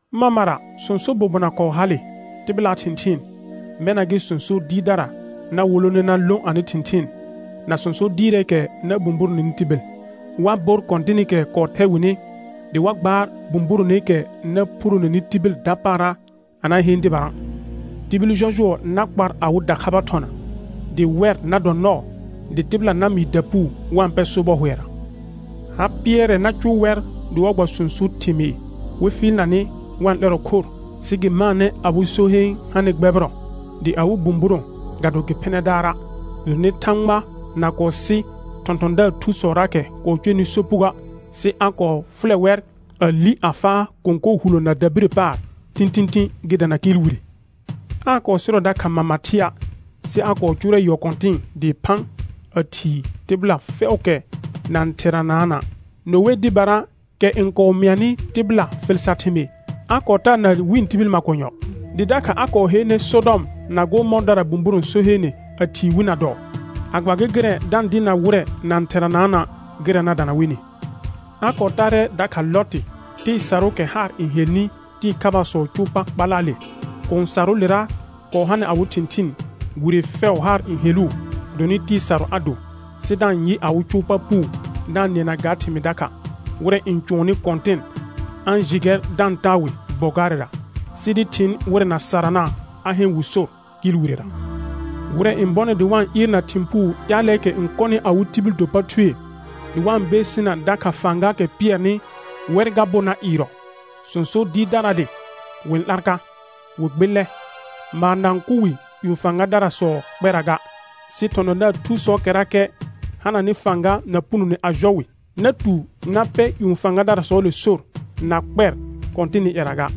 Mamara sõso bobona kɔɔ hale tɩbɩlaa thɩ̃thɩɩn, mɛna gɩ sõso dɩɩrdara na wolone na lõ anɩ thɩ̃thɩɩn na sõso dɩɩrɛɛkɛ na bũburoneni tibil. Wa bor Kɔ̃tɩnɩkɛ kɔɔ thɛ wɩnɩ dɩ wa gbaar bũburoneekɛ na phuroneni tibil dapaara a na heen dɩbara. Tibil jɔjʋɔ na kpar awɩ dakhaba thɔna, dɩ wɛr na dɔ nɔɔ dɩ tɩbɩla na mɩɩ dapuu wa-n pɛ sobɔ hʋɛra. Ha pɩɛrɛ na cʋʋ wɛr dɩ wa gba sõso thɩmɩɩr wɩ fɩɩlna nɩ wa-n 'lɛrɔ khor; sɩ gɩ maanɛ awɩ so heen hanɩ gbɛbɩrɔ, dɩ awɩ bũburõ ga do gɩ phɩnɛ daara'. Gɩdonɩ Thãgba na kɔɔ sɩ thɔ̃thɔ̃daar thusɔraakɛ kɔɔ cʋɛnɩ sopugoə', sɩ a kɔɔ fʋlɛ wɛr, a li a faa kõkor huloona dabirə paar tĩtĩtĩ gɩ dana kɩɩl wire. Aa kɔɔ sɩrɔ dakha mama thɩa', sɩ a kɔɔ cʋʋrɛ yɔ kɔ̃tɩ̃ɩ dɩɩ phã a thii tɩbɩla fɛʋʋkɛ na-n theranaana'; Noe dɩbara, kɛ n kɔɔ mɩanɩ tɩbɩla fɩl sar thɩmɩɩr, a kɔɔ taa na wɩ̃ tibil makonyɔ. Dɩ dakha a kɔɔ heene Sɔdɔm na Gɔmɔɔrdara bũburõ so heene a thii wi na dɔɔ, a gba gɩ gɩrɛ da-n dɩɩrna wɩrɛ na-n theranaana' gɩrɛ na dana wɩnɩ. A kɔɔ taarɛ dakha Lɔtɩ tɩɩ sarʋʋkɛ haar n helnɩ tɩɩ khabaasɔɔ cʋʋ pa kpalaale; kũu sarʋʋlera kɔɔ hanɩ awɩ thɩ̃thɩɩn, wire fɛʋ haar n heluu gɩdonɩ tɩɩ sarʋ a do, sɩ da-n yɩ awɩ cʋʋ pa puu da-n nɩɛna ga thɩmɩɩ dakha. Wɩrɛ n cʋɔnnɩ Kɔ̃tɩn a-n jɩ gɛr da-n taa wɩ bɔ gaarɛra, sɩ dɩ thɩɩn wɩrɛ na sarana', a heen wɩ sor kɩɩl wirera. Wɩrɛ n bɔnɩ dɩ wa-n ɩɩrna thɩ̃ puu ƴaalɛɛkɛ n kɔnɩ awɩ tibil do pa thue, dɩ wa-n beesina dakha fãgaakɛ pɩɛrnɩ, wɛr ga bo na ɩɩrɔ. Sõso dɩɩrdaraale wɩ-n 'lar ka, wɩ gbɩllɛ, maar na-n kʋ wɩ ƴũ fãgadarasɔɔ kpɛra ga; sɩ thɔ̃thɔ̃daar thusɔɔkɛrakɛ hananɩ fãga na punone a jɔ wɩ, na tu na pɛ ƴũ fãgadarasɔɔle sor na kpɛɩ Kɔ̃tɩnɩ ƴɛra ga.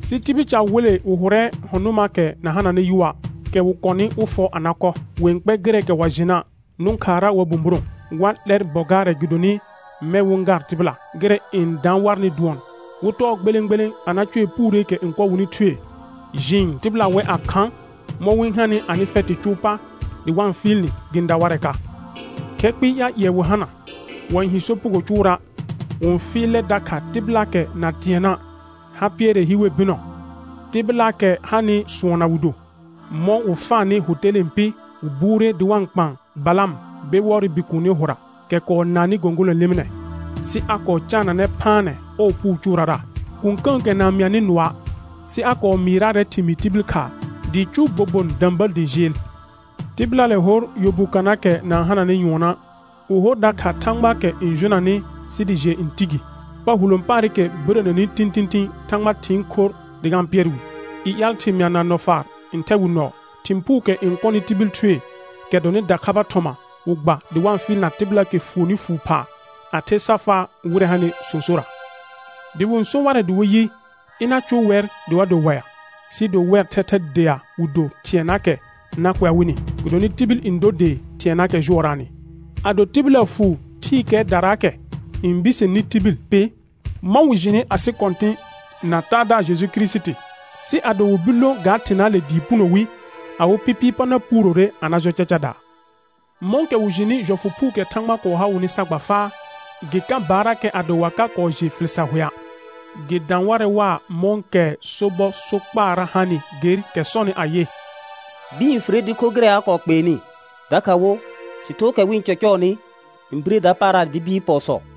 Sɩ tibil ca wele wɩ hʋrɛ lɩɔ̃ nʋnɩaakɛ na hananɩ yʋa', kɛ wɩ kɔnɩ wɩ fɔ a na kɔ; wɩ-n kpɛr gɩrɛɛkɛ wa jɩna', nʋ̃ khaara wa bũburõ. Wa 'lɛr bɔ gaarɛ gɩdonɩ mɛ̃ wɩ-n gaar tɩbɩla. Gɩrɛ n daan warnɩ dʋɔn wɩ tɔɔ gbelẽ gbelẽ a na cʋɛ puureekɛ n kɔ wɩnɩ thue. Jɩɩn tɩbɩla wɛ a khã; mɔ̃ wɩ-n hanɩ anɩ fɛtɩ cʋʋ pa dɩ wa-n fɩɩl nɩ gɩ-n da warɛ ka. Khɛ kpɩɩ ƴaal ƴɩɛ wɩ hana; wa-n hi sopugo cʋʋra'; wɩ-n fɩɩlɛ dakha tɩbɩlaakɛ na tɩɛnna'; ha pɩɛrɛ hi wer bɩnɔ; tɩbɩlaakɛ hanɩ sʋɔnna wɩ do. Mɔ̃ wɩ faanɩ hʋ telẽe pɩ, wɩ buure dɩ wa-n kpaan Balam Bewɔɔrɩ bikuuni hʋra, kɛ kɔɔ naannɩ gõgolõ lɩmɩnɛ. Sɩ a kɔɔ caananɛ phaanɛ ɔɔ puu cʋʋrara. Kũkə̃əkɛ na-n mɩanɩ nʋɔa', sɩ a kɔɔ mɩɩraarɛ thɩmɩɩr tibil khaa dɩɩ cʋʋ bobon də̃bəl dɩ jɩɩl. Tɩbɩlaale hor yɔ bu kanaakɛ na-n hananɩ nyʋɔna'; wɩ hor dakha thãgbaakɛ n jonanɩ sɩ dɩ jɩɛ n ti gi; pa hulõ paarɩkɛ birəneni tĩtĩtĩ Thãgba thɩɩn khorr dɩ ga-n pɩɛr wɩ. I ƴaal thɩmɩa na nɔfaar n thɛ wɩ nɔɔ. Thɩ̃ puukɛ n kɔnɩ tibil thue, kɛ dɔnɩ dakhaba thɔma wɩ gba dɩ wa-n fɩɩlna tɩbɩlaakɛ fuonni fuu phaa a the sa faa wɩrɛ hanɩ sõsorra. Dɩ wɩ-n so warɛ dɩ wɩ yɩ, ɩna cʋʋ wɛr dɩ wa do waɩa, sɩɩ do wɛr thɛthɛ dea wɩ do thɩɛnaakɛ na kʋɛa wɩnɩ, gɩdonɩ tibil n dor dee thɩɛnaakɛ jʋɔraanɩ. Ado tɩbɩla fuu thɩɩkɛɛdaraakɛ n biseneni tibil pɩ, mɔ̃ wɩ jɩnɩ asɩ Kɔ̃tɩ̃ na Taadaar Jeju Kirisiti, sɩ ado wɩ bir lõ ga thɩnaale dɩɩ puno wi, awɩ pɩpɩɩ pa na puurore a na jɔ cacadaa. Mɔ̃kɛ wɩ jɩnɩ jɔfʋ phuukɛ Thãgba kɔɔ ha wɩnɩ sa gba faa, gɩ ka baarrakɛ ado wa ka kɔɔ jɩ fɩl sar hʋɛa'. Gɩ dã warɛ waa mɔ̃kɛ sobɔ sokpaara hanɩ ger kɛ sɔnɩ ayɩ: «Bɩɩn n fire dɩ kho gɩrɛ a kɔɔ kpeenɩ», dakha wo: «Sɩthookɛ wɩ-n cɔcɔɔnɩ n bire dapaara dɩ bɩɩr pɔɔsɔ.»